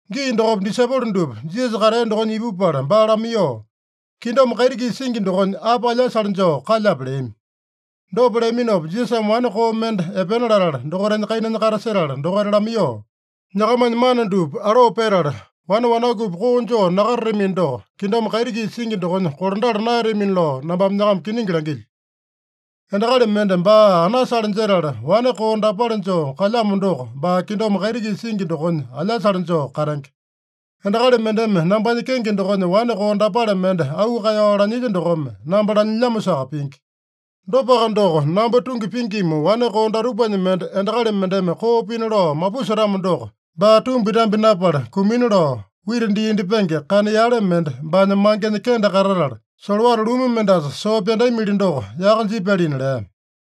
Gii dokopa disaipolo dupa Jisasa katea dokonya ipupala baa lamaiyoo, “Kingdom kaiti-kisa singi dokonya api alyasale joo kalyape?” leami. Dopa leaminopa, Jisasame wane koo mende epena latala, dokaitanya kainanya katasetala dokaita lamaiyoo, “Nyakamanya mana dupa aloo petala, wane wanakupi koo joo nakatatamino doko, kingdom kaiti-kisa singi dokonya kolandala naeyatamina lao nambame nyakama kiningi langilyo. Endakali mende baa anasale jetala, wane koo dapale joo kalyamo doko, baa kingdom kaiti-kisa singi dokonya alyasale joo katenge. Endakali mendeme nambanya kenge dokonya wane koo dapale mende auu kaeyao lanyilya dokome, namba lanyilyamosaka pingi. Dopaka doko, namba tungi pingima wane koo datupanya mende endakali mendeme koo pina lao mapusetamo doko, baa tumbi-tambi napala kumina lao, wita dii indyepenge kana yale mende baanya mangenya kende katatala, solowata lumu mendasa soo pyandamili doko yaka jipyalina” lea.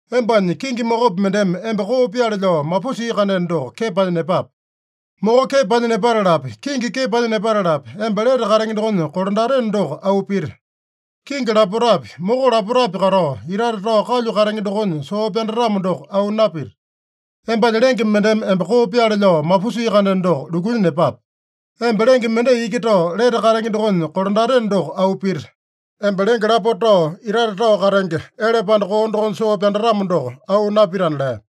Embanya kingi mokopi mendeme emba koo pyaale lao mapusia-kandeno doko, kepanya nepape. Moko kepanya nepatalapi, kingi kepanya nepatalapi, emba lete katenge dokonya kolandateno doko auu pita. Kingi lapotapi, moko lapotapi katao, itate tao kalyu katenge dokonya soo pyandatamo doko auu napita. Embanya lenge mendeme emba koo pyaale lao mapusia-kandeno doko, lukunya nepape. Emba lenge mendai iki tao, lete katenge dokonya kolandateno doko auu pita. Emba lenge lapota tao, itate tao katenge, ele panda koo dokonya soo pyandatamo doko auu napitana” lea.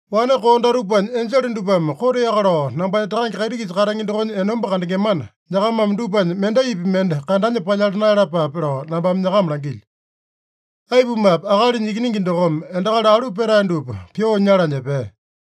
“Wane koo datupanya enjele dupame koteaka lao nambanya Takange kaiti-kisa katenge dokonya enomba kandengemana, nyakamame dupanya mendaipi mende kandanya palyala naeyalapape lao nambame nyakama langilyo. Aipumape, Akalinya Ikiningi dokome endakali alu petae dupa pyoo nyalanya epea.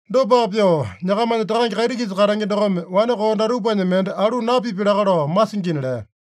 Dopaka pyoo, nyakamanya Takange kaiti-kisa katenge dokome wane koo datupanya mende alu napipya laka lao masingina” lea.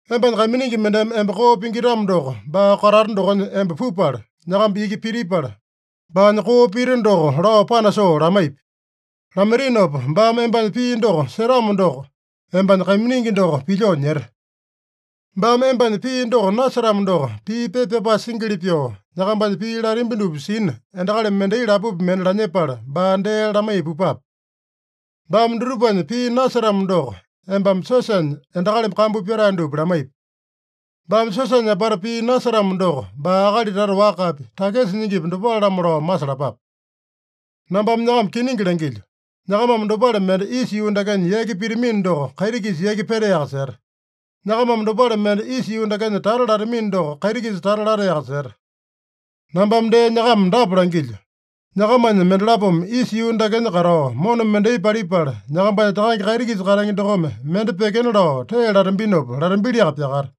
“Embanya kaiminingi mendeme emba koo pingitamo doko, baa katata dokonya emba pupala, nyakamba iki pitipala, baanya koo pita doko lao panasoo lamaipi. Lamaitinopa, baame embanya pii doko setamo doko, embanya kaiminingi doko pilyoo nyete. Baame embanya pii doko nasetamo doko, pii pepa pyapae singili pyoo, nyakambanya pii latambi dupa sina, endakali mendai lapopi mende lanyepala baa dee lamaiya pupape. Baame dutupanya pii nasetamo doko, embame siosanya endakali kambu pyatae dupa lamaipi. Baame siosanya apata pii nasetamo doko, baa akali tata wakapi, takisa nyingipi, dopale-lamo lao masalapape. Nambame nyakama kiningi langilyo: Nyakamame dopale mende isa yuu dakenya yaki pitamino doko, kaiti-kisa yaki petaeyaka seta. Nyakamame dopale mende isa yuu dakenya tata latamino doko, kaiti-kisa tata lataeyaka seta. Nambame dee nyakama dapa langilyo: Nyakamanya mendalapome isa yuu dakenya katao mona mendai palipala, nambanya Takange kaiti-kisa katenge dokome mende pyekena lao tee latambinopa, latambiliaka pyakata.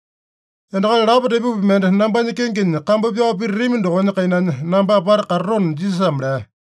Endakali lapo tepopi mende nambanya kengenya kambu pyao pititami dokonya kainanya namba apata katatona” Jisasame lea.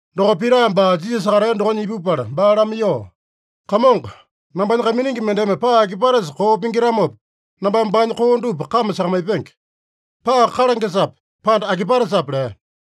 Dokopa Pita baa Jisasa katea dokonya ipupala baa lamaiyoo, “Kamongo, nambanya kaiminingi mendeme paa akipatesa koo pingitamopa, nambame baanya koo dupa kame sakamaipenge? Paa kalangesape, pande akipatesape?” lea.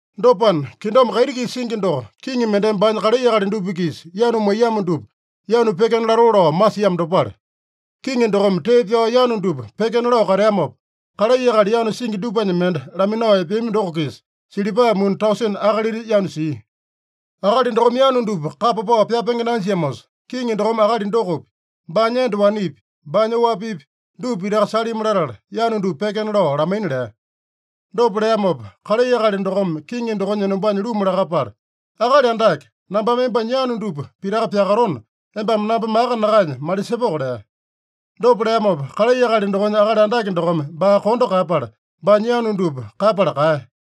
“Dopana, kingdom kaiti-kisa singi doko kiŋi mendeme baanya kalai akali dupa-kisa yanu maiyamo dupa yanu pyekena latoo lao masiamo dopale. Kiŋi dokome tee pyao yanu dupa pyekena lao kateamopa, kalai akali yanu singi dupanya mende laminao epeami doko-kisa silipa muni tausene akalita yanu sia. Akali dokome yanu dupa kapa pao pyapenge nanjiamosa, kiŋi dokome akali dokopi, baanya enda wanepi, baanya oapipi dupa pitaka salimi latala, yanu dupa pyekena lao lamaina lea. Dopa leamopa, kalai akali dokome kiŋi dokonya enombanya luma lakapala, ‘Akali Andake, nambame embanya yanu dupa pitaka pyakatona, embame namba maka nakaenya malisepoko’ lea. Dopa leamopa, kalai akali dokonya akali andake dokome baa kondo kaeyapala, baanya yanu dupa kaeyapala kaeya.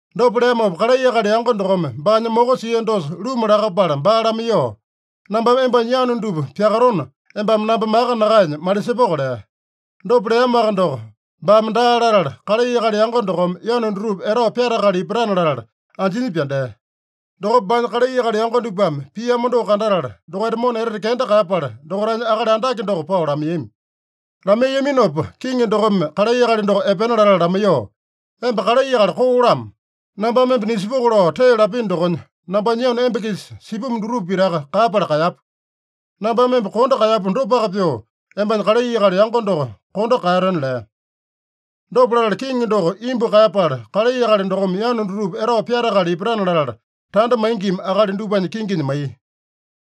Dopa leamopa, kalai akali yango dokome baanya moko sia dosa luma lakapala baa lamaiyoo, ‘Nambame embanya yanu dupa pyakatona, embame namba maka nakaenya malisepoko’ lea. Dopa leamoaka doko baame daa latala, kalai akali yango dokome yanu dutupa etao pyatakala ipatana latala anjinya pyandea. Dokopa baanya kalai akali yango dupame piamo doko kandatala, dokaita mona etete kenda kaeyapala, dokaitanya akali andake doko pao lamaiyami. Lamaiyaminopa, kiŋi dokome kalai akali doko epena latala lamaiyoo, ‘Emba kalai akali koo-lamo! Nambame emba nisepoko lao tee lapino dokonya, nambanya yanu emba-kisa sipumu dutupa pitaka kaeyapala kaeyapu. Nambame emba kondo kaeyapu dopaka pyoo, embanya kalai akali yango doko kondo kaeyateno!’ lea. Dopa latala kiŋi doko imbu kaeyapala, kalai akali dokome yanu dutupa etao pyatakala ipatana latala, tanda maingima akali dupanya kinginya maiya.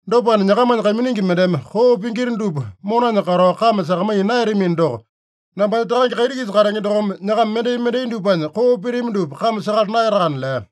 Dopana, nyakamanya kaiminingi mendeme koo pingita dupa monanya katao kame sakamaiya naeyatamino doko, nambanya Takange kaiti-kisa katenge dokome nyakama mendai-mendai dupanya koo pitami dupa kame sakala naeyatakana” lea.